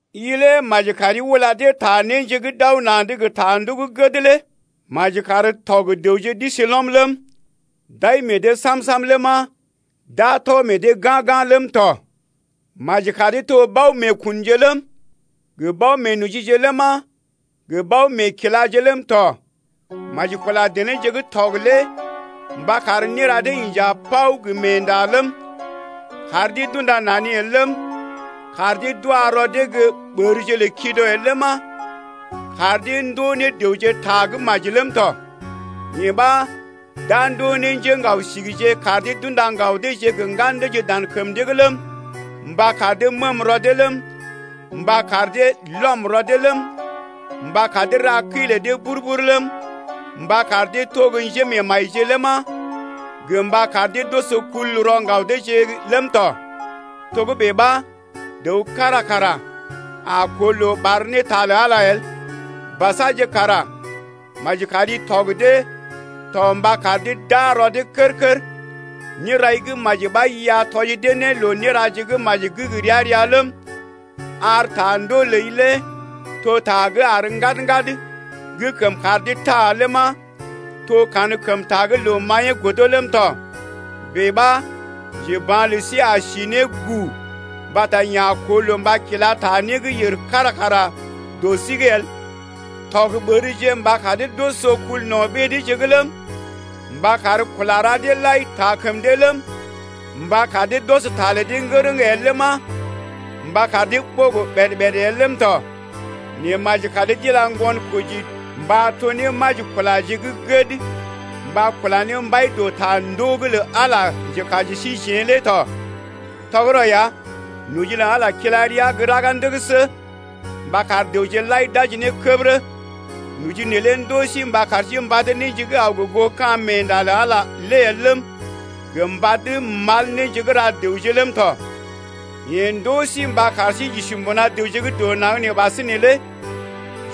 I lé maji kari ula dee ta néje gə́ d’aw na̰’d gə ta ndoo gə́ gəd lé. Maji kar tɔg-dəwje d’isi lɔm ləm, d’ai meḛ dee sam-sam ləma, d’a tɔ meḛ dee ga̰-ga̰ ləm tɔ. Maji kar dee to bao-meekunje ləm, gə bao-meenojije ləma, gə bao-meekilaje ləm tɔ. Maji kula denéje gə́ tɔg lé mba kar néra dee inja paw gə meenda ləm, kar dee d’unda nani el ləm, kar dee d’wa rɔ dee gə́ ɓərje lə kido el ləma, kar dee ndoo ne dəwje ta gə́ maji ləm tɔ. Yee ɓa d’a ndoo ne njéŋgao-sigije kar dee d’unda ŋgaw deeje gə ŋgan deeje dan kəm dee’g ləm, mba kar dee məəm rɔ dee ləm, mba kar dee lɔm rɔ dee ləm, mba kar dee ra kəi lə dee bur-bur ləm, mba kar dee to gə́ njémeemajije ləma, gə mba kar dee d’oso kul rɔ ŋgaw deeje’g ləm tɔ. Togə́bè ɓa dəw kára kara a koo loo ɓar ne ta lə Ala el. Basaje kara maji kari tɔg dee to mba kar dee d’aa rɔ dee kər-kər. Nérai gə́ maji ɓa i a tɔji dee ne loo néraje gə́ maji gə́ gə ria-ria ləm, ar ta ndoo ləi lé to ta gə́ àr ŋgad-ŋgad gə́ kəm kar dee taa ləma, to kankəmta gə́ loo-maḭyee godo ləm tɔ. Bèe ɓa njeba̰ lə sí a si ne gu mbata yeḛ a koo loo mba kila ta né gə́ yèr kára kara dɔ sí’g el. Tɔg ɓərje mba kar dee d’oso kul no̰ ɓée deeje’g ləm, mba kar kula ra deḛ lai taa kəm dee ləm, mba kar dee d’ɔs ta lə dee ŋgərəŋ el ləma, mba kar dee ɓogo ɓèd-ɓèd el ləm tɔ. Nɛ maji kar dee d’ila ŋgonkoji mba to ne majikulaje gə́ gəd mba kula ne mbai dɔ ta ndoo’g lə Ala njekaji lə síjeḛ lé tɔ. Tɔgərɔ ya, noji lə Ala lé kila rəa gə́ raga ndəgəsə mba kar dəwje lai d’aji ne kədərə. Noji neelé ndɔ sí mba kar sí mbad néje gə́ aw gə goo ka̰ meenda lə Ala lé el ləm, gə mbad mal néje gə́ ra dəwje ləm tɔ. Yee ndoo sí mba kar sí j’isi mbuna dəwje gə́ dɔ naŋg nee ɓasinè lé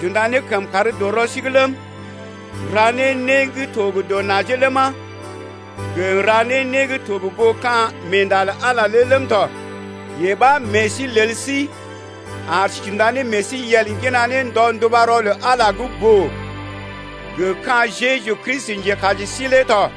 j’unda ne kəmkàr dɔ rɔ sí’g ləm, n’ra ne né gə́ to gə dɔ najee ləma, gə n’ra ne né gə́ to gə goo ka̰ meenda lə Ala lé ləm tɔ. Yee ɓa meḛ sí lel sí ar sí j’unda ne meḛ sí yel ŋgina ne ndɔ ndubarɔ lə Ala gə́ boo gə ka̰ Jeju Kristi, njekaji sí lé tɔ.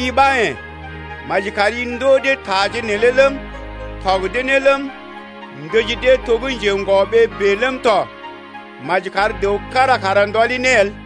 I ɓa yḛ̀, maji kari ndoo dee taje neelé ləm, tɔg dee ne ləm, ndəji dee to gə́ njeŋgɔ-ɓee bèe ləm tɔ. Maji kar dəw kára kara ndɔli ne el.